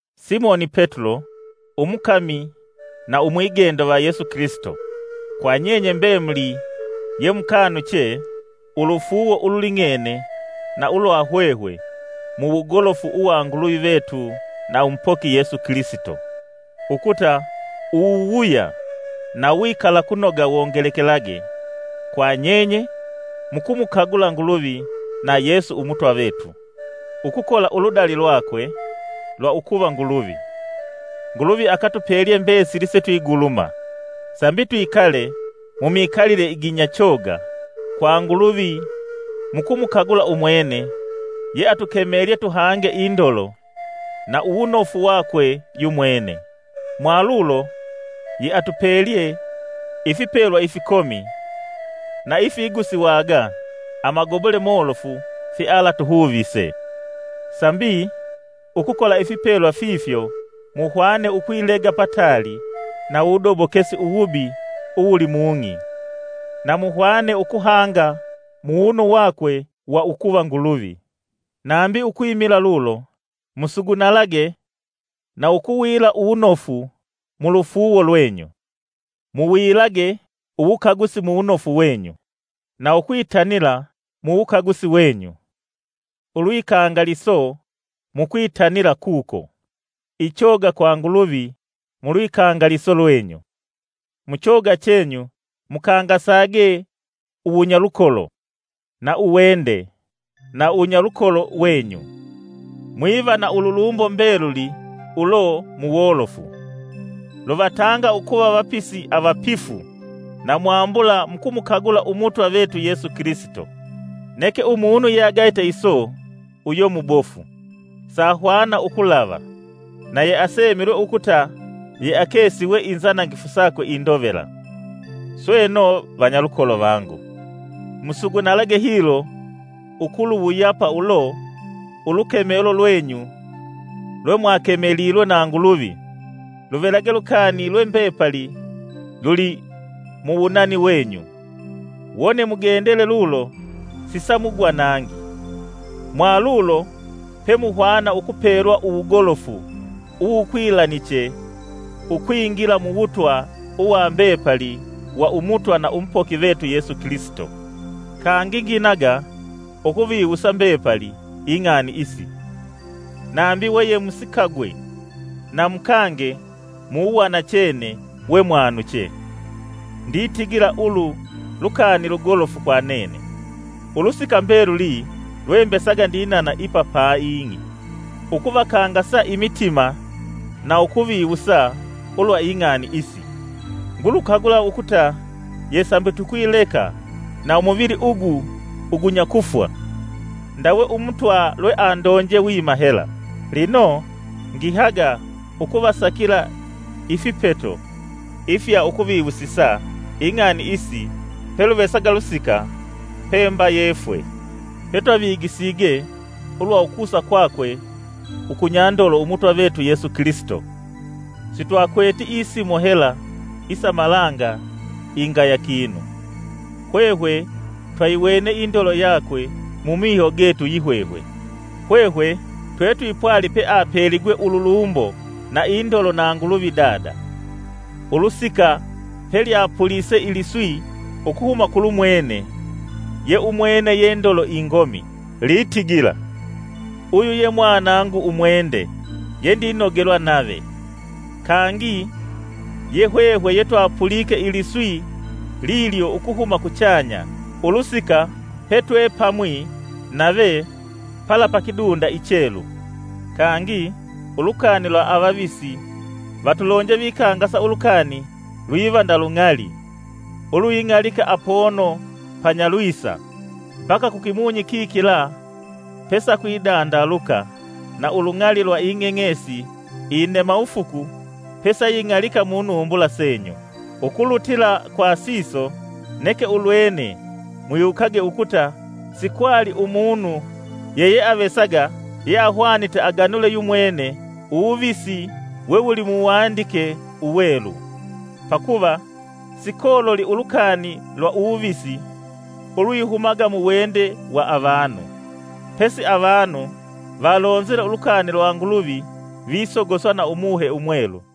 Simoni Petulo, umukami na umwigendo va Yesu Kilisito. Kwa nyenye mbemuli yemukanuche ulufuuwo ululing'ene na ulwa hwehwe muwugolofu uwa Nguluvi vetu na umupoki Yesu Kilisito. Ukuta uwuwuya na uwikalakunoga wongelekelage kwa nyenye mukumukagula Nguluvi na Yesu Umutwa vetu. Ukukola uludali lwakwe lwa ukuva Nguluvi, Nguluvi akatupelye mbesili setwiguluma, sambi twikale mumikalile iginya choga kwa Nguluvi mukumukagula umwene yeatukemelye tuhange indolo na uwunofu wakwe yumwene. Mwalulo yeatupelye ifipelwa ifikomi na ifigusiwaga amagobole molofu fyealatuhuvise, sambi ukukola ifipelwa fifyo muhwane ukwilega pataali na uwudobokesi uwubi uwuli mung'i, na muhwane ukuhanga muwunu wakwe wa ukuva Nguluvi. Nambi ukwimila lulo, musugunalage na ukuwila uwunofu mulufuuwo lwenyu, muwilage uwukagusi muwunofu wenyu, na ukwitanila muwukagusi wenyu, ulwikangaliso mukwitanila kuko, ichoga kwa Nguluvi mulwikangaliso lwenyu, muchoga chenyu mukangasage uwunyalukolo, na uwende na uwunyalukolo wenyu. Mwiva na ululumbo mbeluli ulo muwolofu, luvatanga ukuva vapisi avapifu na mwambula mukumukagula Umutwa vetu Yesu Kilisito. Neke umunu yeagayite iso uyo mubofu, sahwana ukulava, na yeasemilwe ukuta yeakesiwe inzanangifu sakwe indovela. Sweno, vanyalukolo vangu, musugunalage hilo ukuluwuyapa ulo ulukemelo lwenyu lwemwakemelilwe na Nguluvi luvelage lukani lwembepali luli muwunani wenyu; wone mugendele lulo sisamugwa nangi. Mwalulo pemuhwana ukupelwa uwugolofu uwukwilaniche ukwingila muwutwa uwa mbepali wa Umutwa na Umupoki vetu Yesu Kilisito. Kangi nginaga ukuviwusa mbepali ing'ani isi, nambi we yemusikagwe, na mukange muwanachene wemwawanuche. Nditigila ulu lukani lugolofu kwa nene, ulusika mbeluli lwembesaga ndinana ipa pa ing'i, ukuvakangasa imitima na ukuviwusa ulwa ing'ani isi. Ngulukagula ukuta yesambi tukwileka na umuvili ugu ugunya kufwa, ndawe Umutwa lweandonje wima hela. Lino, ngihaga ukuvasakila ifipeto ifya ukuviwusisa ing'ani isi peluvesaga lusika, pemba yefwe. Petwavigisige ulwa ukusa kwakwe ukunyandolo Umutwa vetu Yesu Kilisito, sitwakweti isimo hela isa malanga ingaya kinu. Hwehwe twayiwene indolo yakwe mumiho getu yihwehwe. Hwehwe twetwipwali peapeligwe ululumbo na indolo na Nguluvi Dada, ulusika pelyapulise iliswi ukuhuma kulumwene ye umwene ye Ndolo Ingomi, litigila; “Uyu ye Mwanangu Umwende, yendinogelwa nave.” Kangi, yehwehwe yetwapulike iliswi lilyo ukuhuma kuchanya ulusika petwepamwi nave pala pa kidunda ichelu. Kangi, ulukani lwa avavisi vatulonje vikangasa ulukani lwiva nda lung'ali ulwing'alika apono panyalwisa mbaka kukimunyi kikila pesa kwidandaluka na ulung'ali lwa ing'eng'esi inenawufuku pesaying'alika munumbula senyu. Ukulutila kwa siso, neke ulwene, mwiwukage ukuta sikwali umunu yeyeavesaga yeahwanite aganule yumwene uwuvisi we wuli muwandike Uwelu. Pakuva sikololi ulukani lwa uwuvisi ulwihumaga muwende wa avanu, pesi avanu valonzile ulukani lwa Nguluvi visogoswa na Umuhe Umwelu.